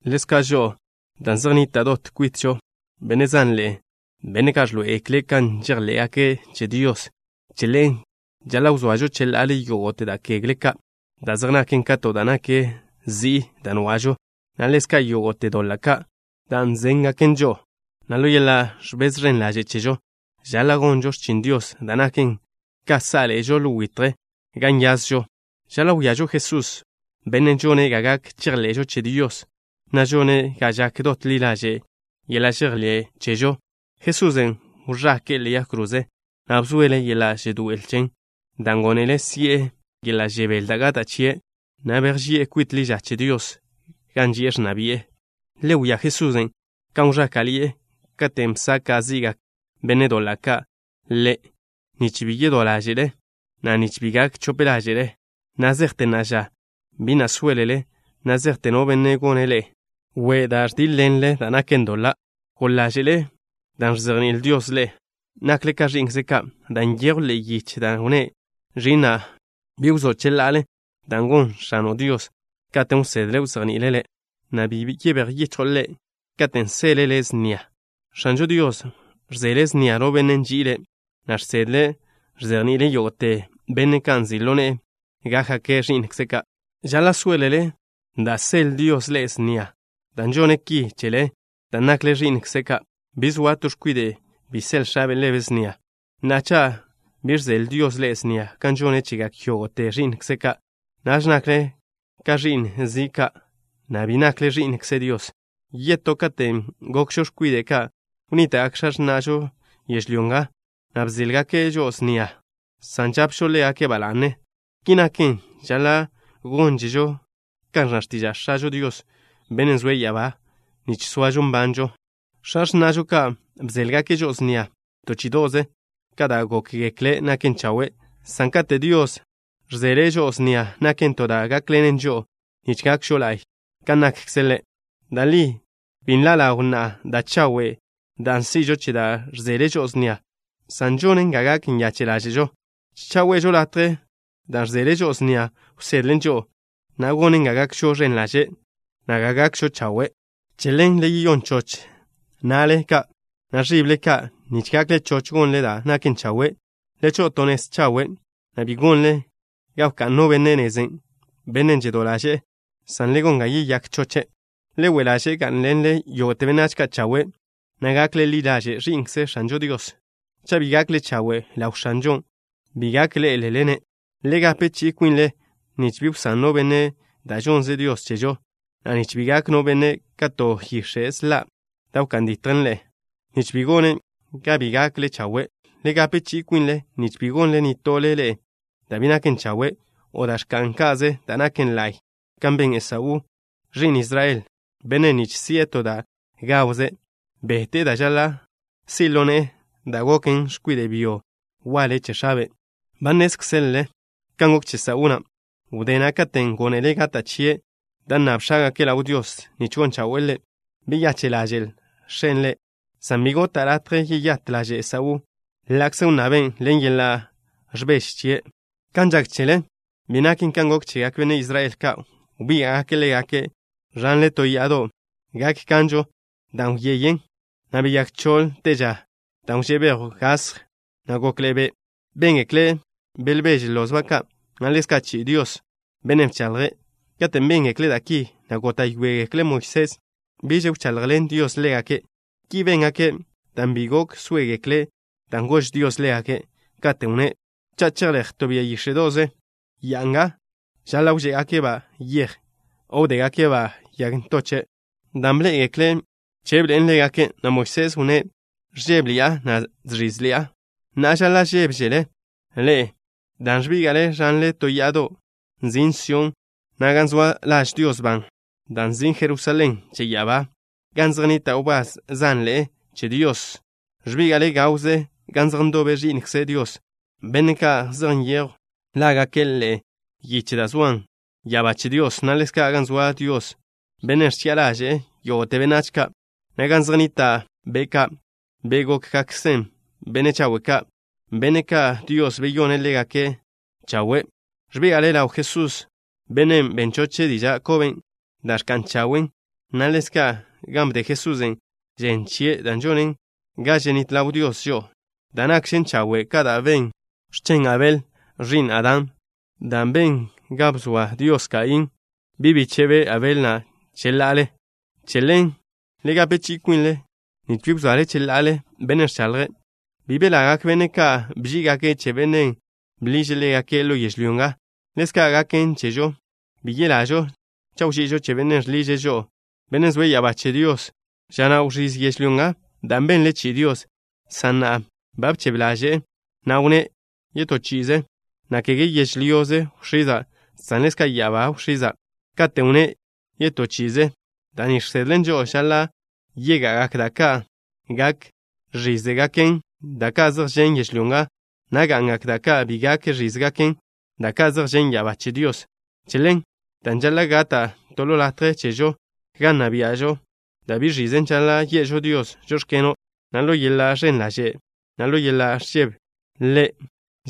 Ḻezka' žo'o, dan' zej nnita' dot kwitžo benne' zanḻe'e, benne' ka' ẕḻoé'egekle' kan žejḻé'gake' che Dios, che ḻen žaḻa' wzoažo cheḻa'ale yógo'te da' kegle ka' da' zej naken ka to da' nak zi'i da' nwa'žo, na' ḻezka' yógo'te doḻa' ka' da' nzéngaken žo'o, na' ḻo yeḻa' ẕbez ẕen ḻaže' chežo, žaḻa' gonžo x̱chin Dios, da' naken ka sá'ḻe'ežo ḻo witje gan nyazžo. Žaḻa' wíažo Jesús, Bennen' žone' ga gak chejḻe'žo che Dios, na' žone' ga žak dot ḻi ḻaže' yeḻa' žejḻé' chežo. Jesusen' wẕake'e ḻe'e yag kroze, na' bzoele' yeḻa' žedoé'el chen, dan' gónele' si'e yeḻa' žebél da' gata' chie', na' bejži'e kwit ḻi ža che Dios, gan ži'e ẕnna bi'e. Le wia Jesusen', kan wẕáka'ḻi'e katen' bsaka' zi'gak benne' doḻa' ka' Ḻe', nich bi yedó ḻáže'le, na' nich bi gak chope ḻáže'le. Na' zejte na'a ža, bi na' sóelele na' zejte no benne' gone' ḻe'e we' dan' ẕdíḻ-ḻenle da' naken doḻa'. ¿Goḻ ḻáže'le dan' ẕzejní'il Dios ḻe'e? Nakle ka ẕi'nkze' ka', dan' nyejw ḻe'e yiche da' wnné': Ẕi'na', bi wzó' cheḻa'ale da' gon X̱ano' Dios, katen' wsedle wzejni'ile' le', na' bi yebéj yichjo' Ḻe' katen' seḻe' le' snia. X̱anžo Dios ẕzeḻe' snia no benne' nži'ile', na' žsedle ẕzejni'ile' yógo'te benne' ka' nzi' ḻo ne'e gákgake' ẕi'nkze' ka'. Žaḻa' sóelele da' seḻ Dios ḻe'e snia, dan' žone' ki chele dan' nakle ẕi'nkze' ka'. Bi zoa to x̱kwide' bi seḻ x̱abe' ḻebe' snia. Na'a, cha' bi ẕzeḻ Dios ḻe'e snia, kan žone' chegak yógo'te ẕi'nkze' ka', naž nakle ka ẕi'n zi' ka', na' bi nakle ẕi'nkze Dios. Yetó, katen' gokžo x̱kwide' ka' wnníta'gak x̱a x̱na'žo yežlyó nga, na' bzéḻgake' žo'o snia, san žapžo ḻégake' ba la'ne. Ki naken, žaḻa' gónžežo kan ẕnna x̱tiža' X̱ažo Dios, Bennen' zoe' ya'abá, nich soažo nbanžo. X̱a x̱na'žo ka' bzéḻgake' žo'o snia to chí'ido'ze ka da' gókgekle' naken chawe', san kate' Dios ẕzeḻe' žo'o snia, naken to da' gákḻenen žo'o, nich gakžo la'y kan nakkze' Ḻe'. Da' li bi nḻa' ḻaw na'a da' chawe' da' si'žon che da' ẕzeḻe' žo'o snia, san žonen ga gak nyache' ḻáže'žo. Cha' we'žo latje da' ẕzeḻe' žo'o snia wsedlen žo'o, na' gonen ga gakžo ẕen ḻaže', na' ga gakžo chawe'. Che ḻen le yeyón choch na'le ka' na' ẕible ka', nich gakle choch gonle da' naken chawe'. Le cho'o to nez chawe', na' bi gonle ga wká'n no benne' nezen', benne' žedó ḻaže'e, san le gon ga yeyák choche'. Le we' ḻaže' gá'nḻenle yógo'te benách ka' chawe', na' gakle ḻi ḻaže' ẕi'nkze X̱anžo Dios. Cha' bi gakle chawe' ḻaw X̱anžon', bi gak ḻé'elele-ne'. Le gape chi'i kwinle nich bi wsán no benne' da' žonnze Dios chežo, na' nich bi gak no benne' ka to yix̱e' sḻa', da' wká'n ditjen ḻe'e, nich bi gone' ga bi gakle chawe'. Le gape chi'i kwinle nich bi gonle nitole ḻe'e da' bi naken chawe' o da' ẕka'n ka'ze da' naken la'y, kan ben Esaú, ẕi'n Israel, bennen' nich si'e to da' gawze' bete'e da' žaḻa' si' ḻo ne'e dan' goke' x̱kwide' byo waḻe che x̱abe'. Ba nnézkzelele kan gok che Esaú na' wdé na' katen' gónele' gata' chie' da' nnab x̱ágake' ḻaw Dios nich gon chawe'e ḻe'. Beyache' ḻaže'l x̱e' ḻe', san bi gota' latje yeyát ḻaže' Esaú na' ḻa'kze wnnaben' ḻen yeḻa' ẕbeže chie'. Kan žak chele bi naken kan gok chegak benne' Israel ka'. Wbíga'gake' ḻégake' ẕanle to ya'a da' gak kanžo, da' wyeyen, na' beyák choḻ te ža dan' wžé' bejw gasj, na' gokḻe'e be'. Béngekle' belbeže lozba' ka', na' ḻezka' chi'i Dios, Bennen' bchaḻje'. Katen' béngekle' da' ki, na' góta'yoegekle' Moisés biž wchaḻjḻen Dios ḻégake'. Ki béngake' dan' bi gok sóegekle' da' gož Dios ḻégake', katen' wnné': “Cha' chejléj to bia yíx̱e'do'ze ya'a nga, žaḻa' wžé'egake'-ba' yej, o wdégake'-ba' yag ntoche'.” Dan' bḻé'egekle' bchebḻe'en ḻégake', na' Moisés wnné': “Ẕžébeḻi'a, na' žẕízeḻi'a.” Na'a, žaḻa' žébežele ḻe'e dan' ẕbíga'le ẕanle to ya'a da' nzin' Sión, na' gan zoa laž Dios ban, dan' nzin' Jerusalén che ya'abá, gan zej nnita' wbás zanḻe'e che Dios. Ẕbíga'le gawze gan zej ndobe ẕi'nkze Dios, benne' ka' zej nyejw lágake' ḻe'e yiche da' zoan ya'abá che Dios, na' ḻezka' gan zoa Dios, Bennen' ẕchi'a ḻaže'e yógo'te benách ka', na' gan zej nnita' be' ka', be' gókgakkzen benne' chawe' ka', benne' ka' Dios beyone' ḻégake' chawe'. Ẕbíga'le ḻaw Jesús, Bennen' ben choche' diža' koben' da' ẕka'n chawen', na' ḻezka' gan bde Jesusen' žen chie' da' žonen ga ženít ḻaw Dios žo'o, da' nakžen chawe' ka da' ben x̱chen Abel, ẕi'n Adán, dan' ben ga bzoa Dios Kaín, bi' bíche'be' Abel na' cheḻa'ale. Che ḻen, le gape chi'i kwinle nich bi wzoale cheḻa'ale Bennen' ẕchaḻje'. Bi belagak benne' ka' bží'igake' che bennen' bḻiže' ḻégake' ḻo yežlyó nga. Ḻezka' gaken chežo, bi yelažo cha' wži'ižo che Bennen' žḻiže' žo'o, Bennen' zoe' ya'abá che Dios. Ža na' wẕíz yežlyó nga dan' benle chi'i Dios, san na'a ba bchebe ḻaže'e, na' wnné': “Yetoze chi'i, na' kege yežlyoze wx̱iza', san ḻezka' ya'abá wx̱iza'.” Katen' wnné': “Yetoze chi'i” da' ni žsedlen žo'o žaḻa' yega'agak da' ka' gak ẕízegaken, da' ka' zej žen' yežlyó nga, na' ga'ngak da' ka' bi gak ẕízegaken, da' ka' zej žen' ya'abá che Dios. Che ḻen, dan' žaḻa' gata' to latje chežo gan nna bia'žo, da' bi ẕizen, žaḻa' ye'žo Dios: “Žóx̱keno'” na' ḻo yeḻa' ẕen ḻaže', na' ḻo yeḻa' ẕžebe Ḻe'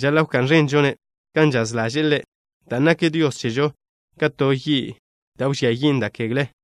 žaḻa' wká'n ẕenžo-ne' kan žaz ḻaže'e Ḻe', dan' nak Dios chežo ka to yi' da' wžía yin' da' kegle.